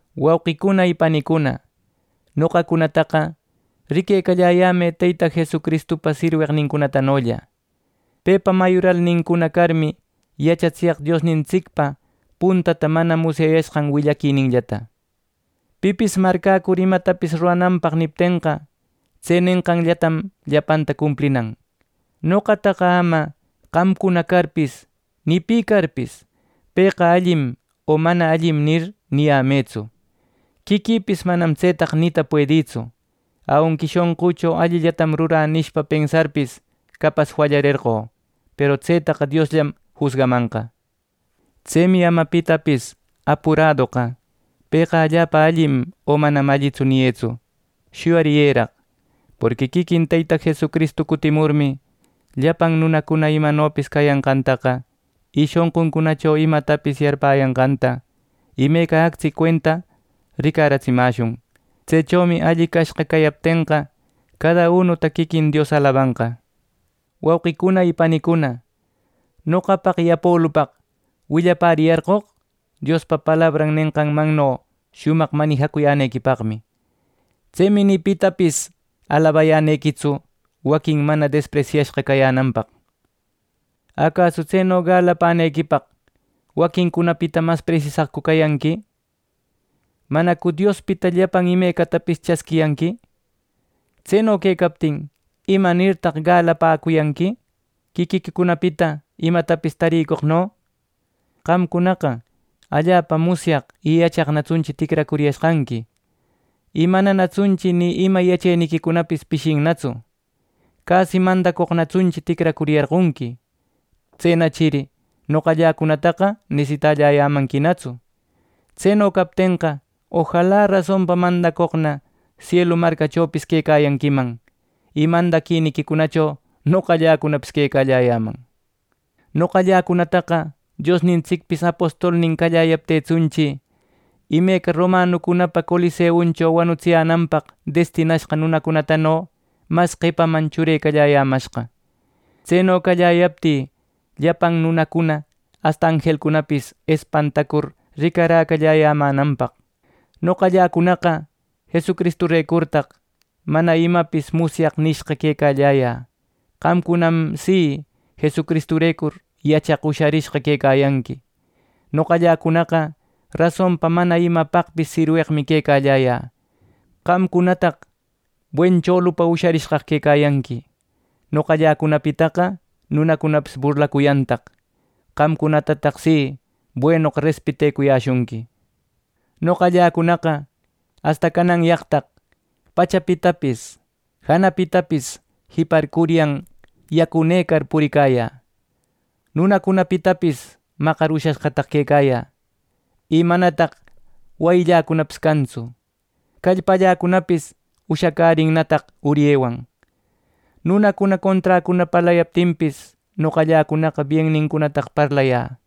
Wauqicuna y panicuna, noqacunataqa riquecalläyämë Teyta Jesucristupa sirweqnincunatanolla. Pepa mayuralnincuna carmi yachatsiyaq Diosnintsicpa puntata mana musyayashqan willaquininllata. Pipis marcäcur imatapis rurananpaq niptenqa. Tse nenqanllatam llapanta cumplinan. Noqataqa ama: qamcuna carpis ni pi carpis “Pëqa allim o mana allim” nir, niyämëtsu. Quiquïpis manam tsetaqa nita puedïtsu. Aunqui shonqücho “Allillatam rurä” nishpa pensarpis, capas fallarerqö. Peru tsetaqa Diosllam jusgamanqa. Tsemi ama pitapis apuradoqa “Pëqa allapa allim o manam allitsu” niyëtsu. Shuyariyëraq. Porqui quiquin Teyta Jesucristu cutimurmi, llapan nunacuna imanopis cayanqantaqa, y shonquncunacho imatapis yarpäyanqanta imeca actsi cuenta ricaratsimäshun. Tsechomi alli cashqa cayaptenqa, cada unuta quiquin Dios alabanqa. Wauqicuna y panicuna, noqapaq y Apolupaq willapäriyarqoq Diospa palabran nenqanmanno shumaq manijacuyänequipaqmi. Tsemi ni pitapis alabayänequitsu, waquin mana despresyäshqa cayänanpaq. ¿Acasu tseno galapänequipaq waquincunapita mas presisaqcu cayanqui! ¿Manacu Diospita llapan imecatapis chasquiyanqui! Tseno quecaptin, ¿imanirtaq galapäcuyanqui, quiquiquicunapita imatapis tarïcoqno! ¡Qamcunaqa allapa musyaq, y yachaqnatsunchi ticracuriyashqanqui, y mananatsunchi ni ima yacheniquicunapis pishinnatsu! ¡Casi mandacoqnatsunchi ticracuriyarqonqui! ¡Tsenachiri noqalläcunataqa nesitalläyämanquinatsu! ¡Tseno captenqa, ojala rasonpa mandacoqna sielu marcachopis quecayanquiman y mandadiquicunacho noqalläcunapis quecalläyäman! Noqalläcunataqa Diosnintsicpis apostolnin calläyaptïtsunchi imeca romanucunapa coliseuncho wanutsiyänanpaq destinashqa nunacunatano mas qepaman churecalläyämashqa; tseno calläyaptï, llapan nunacuna asta anjelcunapis espantacur ricaräcalläyämänanpaq. Noqalläcunaqa ¡Jesucristurecurtaq “Mana imapis musyaq” nishqa quecalläyä! Qamcunam ¡si Jesucristurecur yachaq usharishqa quecayanqui! ¡Noqalläcunaqa rasonpa mana imapaqpis sirweqmi quecalläyä! ¡Qamcunanataq buen cholupa usharishqaqa quecayanqui! ¡Noqalläcunapitaqa nunacunapis burlacuyantaq! ¡Qamcunatataq si, buenoqa respetecuyäshunqui! ¡Noqalläcunaqa asta cananyaqtaq pachapitapis, janapitapis jiparcuryan yacunëcar puricayä! ¡Nunacunapitapis maqar ushashqataq quecayä, y manataq wayilläcunapis cantsu! ¡Callpalläcunapis ushacärinnataq uryewan! ¡Nunacuna conträcuna parlayaptinpis, noqalläcunaqa biennincunataq parlayä!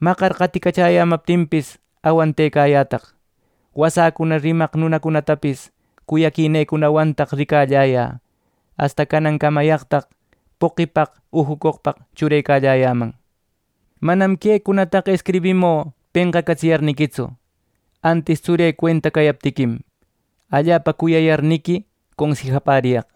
¡Maqar qaticachäyämaptinpis awantecayätaq! ¡Wasäcuna rimaq nunacunatapis cuyaquinecunawantaq ricalläyä! ¡Asta canan camayaqtaq poqipaq ujucoqpaq churecalläyäman! Manam quecunataqa escribimü penqacatsiyarniquitsu; antis tsurï cuenta cayaptiquim, allapa cuyayarniqui consijapäriyaq.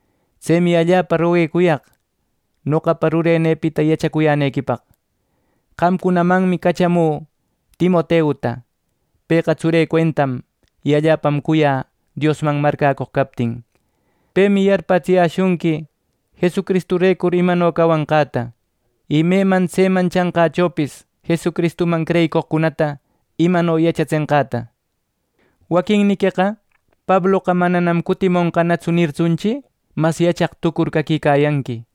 Tsemi allapa roguecuyaq noqapa rurenïpita yachacuyänequipaq. Qamcunamanmi cachamü Timoteuta. Pëqa tsurï cuentam y allapam cuyä Diosman marcäcoq captin. Pemi yarpätsiyäshunqui Jesucristurecur imano cawanqäta y meman tseman chanqächopis Jesucristuman creyicoqcunata imano yachatsenqäta. Waquinniqueqa “Pabloqa mananam cutimonqanatsu” nirtsunchi, mas yachaq tucur caquicayanqui;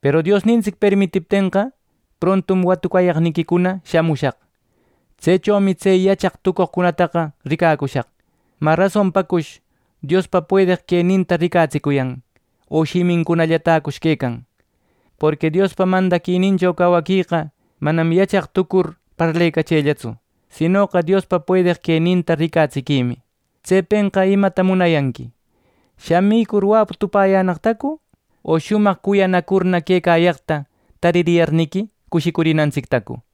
peru Diosnintsic permitiptenqa, prontum watucayaqniquicuna shamushaq. Tsechomi tse yachaq tucoqcunataqa ricacushaq. ¿Mä rasonpacush Diospa puedeq queninta ricatsicuyan! ¿O shimintällacush quecayan! Porqui Diospa mandaquinincho cawaqueqa manam yachaq tucur parlecachellatsu; sinoqa Diospa puedeq queninta ricatsiquimi. Tsepenqa imata munayanqui, ¿shamicur wapu tupäyänaqtacu, o shumaq cuyanacurna quecayaqta tariyarniqui cushicurinantsictacu!